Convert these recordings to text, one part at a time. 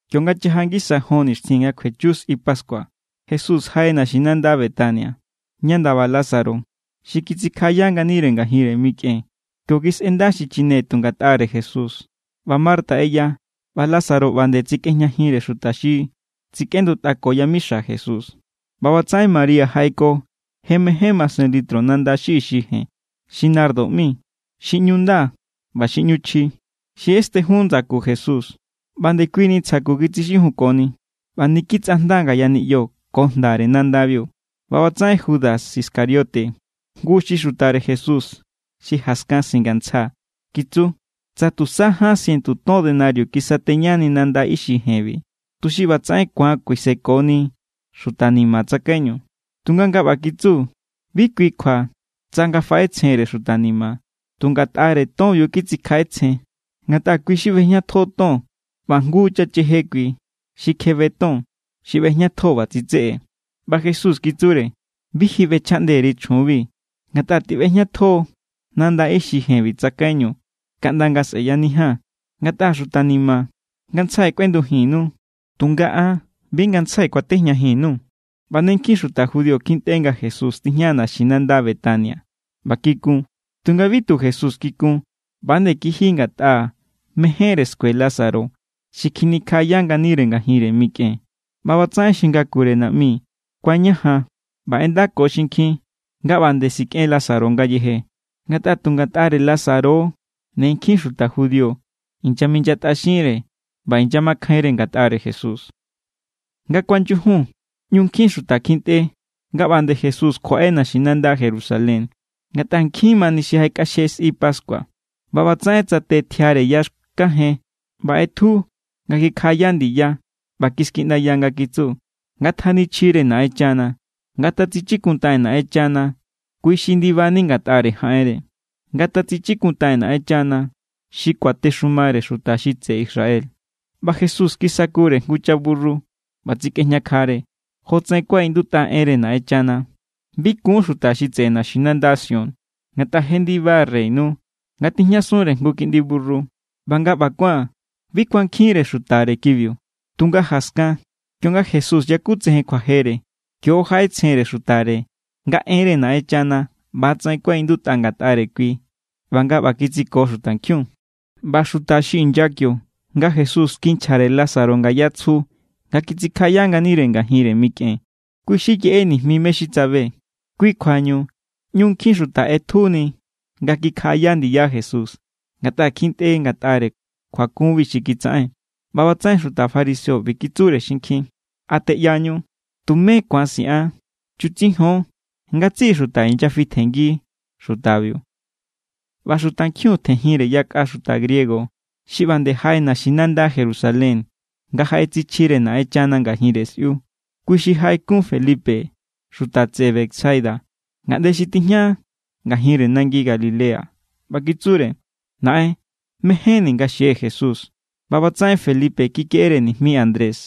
Kionga chaja ngisa jon nixtjin nga kjuechu sꞌi pascua, Jesús jaꞌe naxinanda Betania, ña ndaba Lázaro xi kitsikjaꞌaya nganire ngajinre mikꞌen. Kio kisꞌenda xi chine tu ngatꞌare Jesús, ꞌba Marta ꞌeya, ꞌba Lázaro ꞌba nde tsekꞌejñajinre xuta xi tsikꞌendutꞌako yamixa Jesús. ꞌBa ꞌbatsaꞌen María jaꞌeko je mején masen litro nanda xi ixi jen xi nardo ꞌmi, xi ꞌñu nda ꞌba xi ꞌñu chji, xi ꞌestenjun ndsaku Jesús ꞌba ndekuini ntsja ku kitsixijunkoni. ꞌBa niki tsꞌajnda ngaya niꞌyo ko jndare nandabiu. ꞌBa ꞌbatsaꞌen Judas Iscariote, jngu xi xutare Jesús xi jaskan singantsja, kitsu: —Tsa tusa ján sientu ton denario kisateñani nanda ixi jenbi, tuxi ꞌbatsaꞌen ku̱an kuisekoni xuta ni̱ma̱ tsakaiñu. Tunga nga ꞌba kitsu bi kui kjua tsa nga faꞌetsjenre xuta ni̱ma̱. Tu ngatꞌare tonbiu titsikjaꞌetsjen, ngatꞌa kui= xi ꞌbejñatjo ton ꞌba jngu chacheje kui xi kjebe ton xi ꞌbejñatjo ꞌba tsitseꞌe. ꞌBa Jesús kitsure: —Bi ji bꞌechjaꞌnde_ri chjunbiu. Ngatꞌa tiꞌbejñatjo= nanda ixi jenbi tsakaiñu kaꞌnda nga sꞌe̱yanijia̱n. Ngatꞌa xuta ni̱ma̱ ngantsjai kꞌuendujinnu, tunga an bi ngantsjai kuatejñajin_nuu̱. ꞌBa ne nkjin xuta judío kjintꞌe nga Jesús tijña naxinanda Betania ꞌba kikun. Tunga bi tu Jesús kikun. ꞌBa=nde kiji ngatꞌa mejénre skue Lázaro xi kjinikjaꞌaya nganire ngajinre mikꞌen. ꞌBa ꞌbatsaꞌen xi ngakure naꞌmi kuañajan ꞌba ꞌendako xinkjin nga ꞌba nde sikꞌen Lázaro ngayeje. Ngatꞌa tu ngatꞌare Lázaro= ne nkjin xuta judío inyaminyatꞌaxinre ꞌba inyamakjainre ngatꞌare Jesús. Nga kuanyujun ñu nkjin xuta kjintꞌe nga ꞌba nde Jesús kjuaꞌe naxinanda Jerusalén, ngatꞌa nkjin mani xi jaꞌekꞌaxje sꞌi pascua. ꞌBa ꞌbatsaꞌen tsate tjiare ya xkajen ꞌba ꞌetju nga kikjaꞌaya ndiya ꞌba kiskiꞌndaya nga kitsu: —¡Ngatjanichjire Naꞌenchana! ¡Ngatatsichikuntaꞌen Naꞌenchana kui xi ndibani ngatꞌare jaꞌenre! ¡Ngatatsichikuntaꞌen Naꞌenchana xi kuatexumare xuta xi tseꞌe Israel! ꞌBa Jesús kisakure jngu chaburru ꞌba tsikꞌejñakjare, jotsaꞌen kuaꞌindutꞌa enre Naꞌenchana: Bi kun xuta xi tseꞌe naxinanda Sión, ngatꞌa je ndiba reynu nga tijñasunre jngu kiꞌndi burru. ꞌBa nga ꞌba kuán, bi kuankjinre xutare kibiu. Tunga jaskan, kionga Jesús yakutsejen kjuajere, kio= jaꞌetsjenre xutare nga enre Naꞌenchana ꞌba=tsaꞌen kuaꞌindutꞌa ngatꞌare kui ꞌba nga ꞌba kitsiko xutankjiun. ꞌBa xuta xi inya kionga Jesús kinchjare Lázaro ngaya tsju nga kitsikjaꞌaya nganire ngajinre mikꞌen, kui xi yeꞌe nijmi mé= xi tsabe. Kui= kjuañu ꞌñu nkjin xuta ꞌetjuni nga kikjaꞌaya ndiya Jesús, ngatꞌa kjintꞌe ngatꞌare kjuakunbiu xi kitsaꞌen. ꞌBa ꞌbatsaꞌen xuta fariseo ꞌbi kitsure xinkjin: —¿A teꞌyañu? Tumé ku̱an siꞌan. Chutsijon. Ngatsiꞌi xuta inyafitjenngi xutabiu. ꞌBa xutankjiun tjenjinre yakꞌa xuta griego xi ꞌba nde jaꞌe naxinanda Jerusalén nga jaꞌetsichjire Naꞌenchana ngajinre sꞌiu. Kui xi jaꞌekun Felipe, xuta tseꞌe Betsaida, ngaꞌnde xi tijña ngajinre nangi Galilea, ꞌba kitsure: —Naꞌen, mejénni̱ nga xie̱ Jesús. ꞌBa ꞌbatsaꞌen Felipe kikeꞌere nijmi Andrés,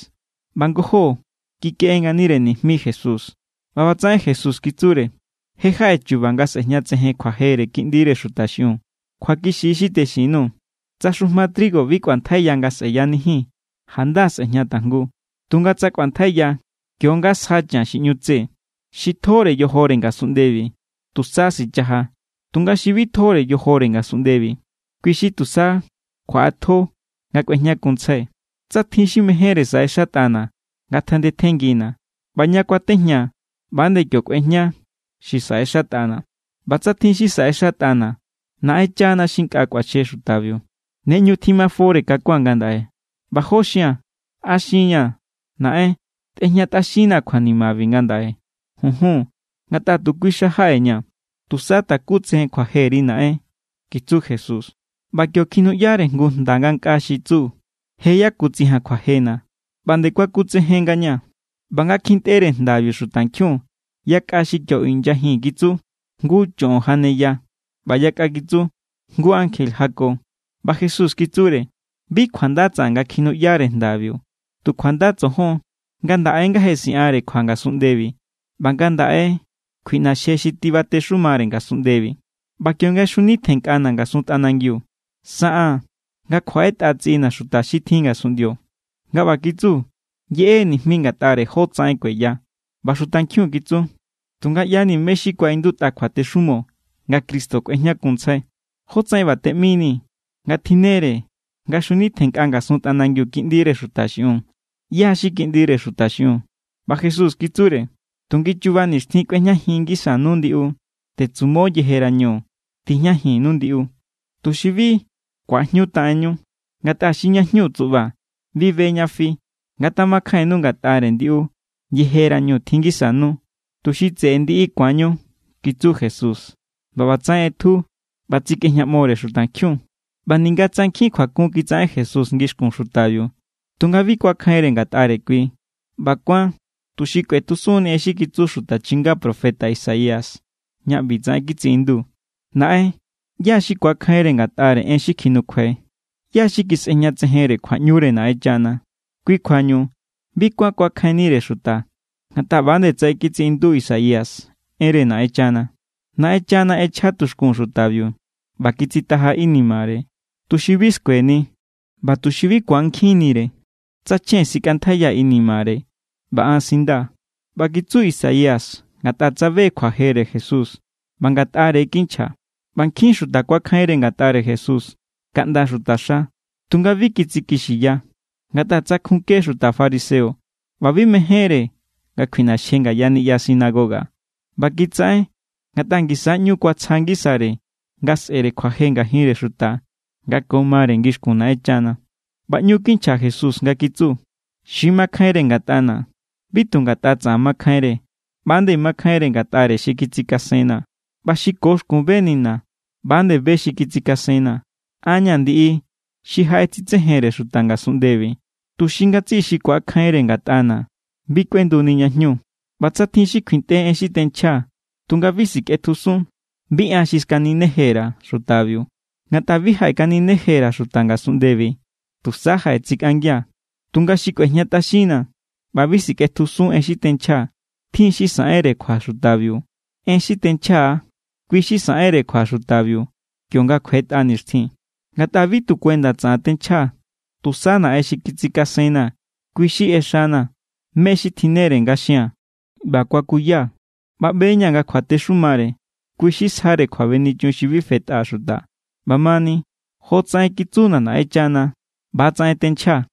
ꞌba ngojó kikeꞌe nganire nijmi Jesús. ꞌBa ꞌbatsaꞌen Jesús kitsure: —Je jaꞌe chu̱ba̱ nga sꞌe̱jñatsejen kjuajere Kiꞌndire Xuta xiꞌiun. Kjuakixi= xi texin_nuu̱. Tsa xujma trigo bi kꞌuantjaiya nga sꞌeyanijin, janda sꞌe̱jña tajngu. Tunga tsa kꞌuantjaiya, kio= nga sja chan xi ꞌñu tse. Xi tjore yojore ngasunꞌndebi, tusa sichaja. Tunga xi bi tjore yojore ngasunꞌndebi, kui= xi tusa kjuaꞌatjo nga kꞌuejñakunntsjai. Tsa tjin xi mejénre saꞌexatꞌana̱, ngatjandetjenngina̱. ꞌBa ña kuatejñaa̱, ꞌba=nde kio kꞌuejña xi saꞌexatꞌana̱. ꞌBa tsa tjin xi saꞌexatꞌana̱, Naꞌenchana xi nkꞌa kꞌuaxje xutabiu. ’Ne ꞌñu tjimafore kakua̱n ngandaꞌe. ¿ꞌBa jó xia̱n? ¿A xinña̱: “Naꞌen, tꞌejñatꞌaxinnaa̱ kjuanimabi ngandaꞌe”? Junjun, ngatꞌa tu kui xa jaꞌeña̱. Tusa takutsejen kjuajeri, Naꞌen —kitsu Jesús. ꞌBa kio kjinuꞌyare jngu jnda ngankꞌaa xi kitsu: —Je yakutsijia̱n kjuajena̱ ꞌba nde kuakutsejen ngañaa̱. ꞌBa nga kjintꞌere jndabiu xutankjiun, yakꞌa xi kio inyajin kitsu: —Jngu choꞌon janeya. ꞌBa yakꞌa kitsu: —Jngu ankje jako. ꞌBa Jesús kitsure: —Bi kjuanda tsaꞌan nga kjinuꞌyare jndabiu, tu kjuanda tsojon. Ngandaꞌe= nga je siꞌanre kjua ngasunꞌndebi, ꞌba ngandaꞌe= kjuiꞌnaxje xi tibatexumare ngasunꞌndebi. ꞌBa kionga xjunitjennkꞌana̱ ngasun tꞌanangiu, saꞌaa̱n nga kjuaꞌetꞌa tsiꞌina̱ xuta xi tjin ngasunꞌndio. Nga ꞌba kitsu yeꞌe= nijmi ngatꞌare jótsaꞌen kueya. ꞌBa xutankjiun kitsu: —Tunga ꞌya=ni mé= xi kuaꞌindutꞌa kjuatexumo, nga Cristo kꞌuejñakunntsjai. ¿Jótsaꞌen ꞌba teꞌminii̱ nga tjinnere nga chjunitjennkꞌa ngasun tꞌanangiu Kiꞌndire Xuta xiꞌiun? ¿ꞌYá= xi Kiꞌndire Xuta xiꞌiun? ꞌBa Jesús kitsure: —Tu ngichuba nixtjin kꞌuejñajin ngisanu ndiꞌu. Tetsumo yejerañu tijñajinnu ndiꞌu, tuxi bi ku̱ajñutaꞌenninu. Ngatꞌa xi ña jñu tsuꞌba bi be ñá fi. Ngatjamakjainnu ngatꞌare ndiꞌu yejerañu tjin ngisanu, tuxi tseꞌe ndiꞌu ku̱anñu —kitsu Jesús, ꞌba ꞌbatsaꞌen ꞌetju ꞌba tsikꞌejñaꞌmore xutankjiun. ꞌBa ninga tsa nkjin kjuakun kitsaꞌen Jesús ngixkun xutabiu, tunga bi kuakjainre ngatꞌare kui. ꞌBa kuán tuxi kꞌuetjusunni en xi kitsu xuta chinga profeta Isaías, ña ꞌbitsaꞌen kitsiꞌindu: Naꞌen, ¿ꞌyá= xi kuakjainre ngatꞌare en xi kjinukjuai̱? ¿ꞌYá= xi kisꞌejñatsejenre kjuaꞌñure Naꞌenchana? Kui kjuañu bi kuán kuakjainnire xuta, ngatꞌa ꞌba nde tsaꞌen kitsiꞌindu Isaías enre Naꞌenchana: Naꞌenchana ꞌechja tuxkun xutabiu ꞌba kitsitaja inimare, tuxi bi skueni, ꞌba tuxi bi ku̱ankjinnire, tsa chjen sikꞌantjaiya inimare, ꞌba an sindaa̱. ꞌBa kitsu Isaías ngatꞌa tsabe= kjuajere Jesús ꞌba Ngatꞌare= kinchja. ꞌBa nkjin= xuta kuakjainre ngatꞌare Jesús kaꞌnda xutaxa. Tunga bi kitsikixiya, ngatꞌa tsakjunke= xuta fariseo ꞌba bi mejénre nga kjuiꞌnaxje ngaya niꞌya sinagoga. ꞌBa kitsaꞌen ngatꞌa ngisa= ꞌñu kuatsja ngisare nga sꞌe̱re kjuaje ngajinre xuta nga ko mare ngixkun Naꞌenchana. ꞌBa ꞌñu kinchja Jesús nga kitsu: —Xi makjainre ngatꞌana̱, bi tu ngatꞌa tsaꞌan makjainre. ꞌBa=nde makjainre ngatꞌare xi kitsikasenna̱. ꞌBa xi ko xkun benina̱, ꞌba=nde be xi kitsikasenna̱. An= ña̱ ndiꞌi xi jaꞌetsitsejenre xuta ngasunꞌndebi, tuxi ngatsiꞌi xi ku̱akjainre ngatꞌana̱ bi kꞌuenduni ña jñu. ꞌBa tsa tjin xi kjuintꞌe en xi tenchjaa̱ tunga bi sikꞌetjusun, bi an xi skanineje_ra̱ xutabiu. Ngatꞌa bi jaꞌekanineje_ra̱ xuta ngasunꞌndebi. Tusa jaꞌetsikꞌangia̱. Tunga xi kꞌuejñatꞌaxinna̱ ꞌba bi sikꞌetjusun en xi tenchjaa̱, tjin= xi saꞌenre kjua xutabiu. En xi tenchjaa̱=, kui= xi saꞌenre kjua xutabiu kionga kjuetꞌa nixtjin. Ngatꞌa bi tu kuenda tsaꞌan tenchjaa̱. Tusa Naꞌen xi kitsikasenna̱, kui= xi ꞌexana̱ mé= xi tjinnere nga xia̱n ꞌba kuakuyaa̱. ꞌBa ꞌbe=ña̱ nga kjuatexumare, kui= xi sjare kjuabenichun xi bi fetꞌa xuta. ꞌBamani, jotsaꞌen kitsuna̱ Naꞌenchana, ꞌba=tsaꞌen tenchjaa̱.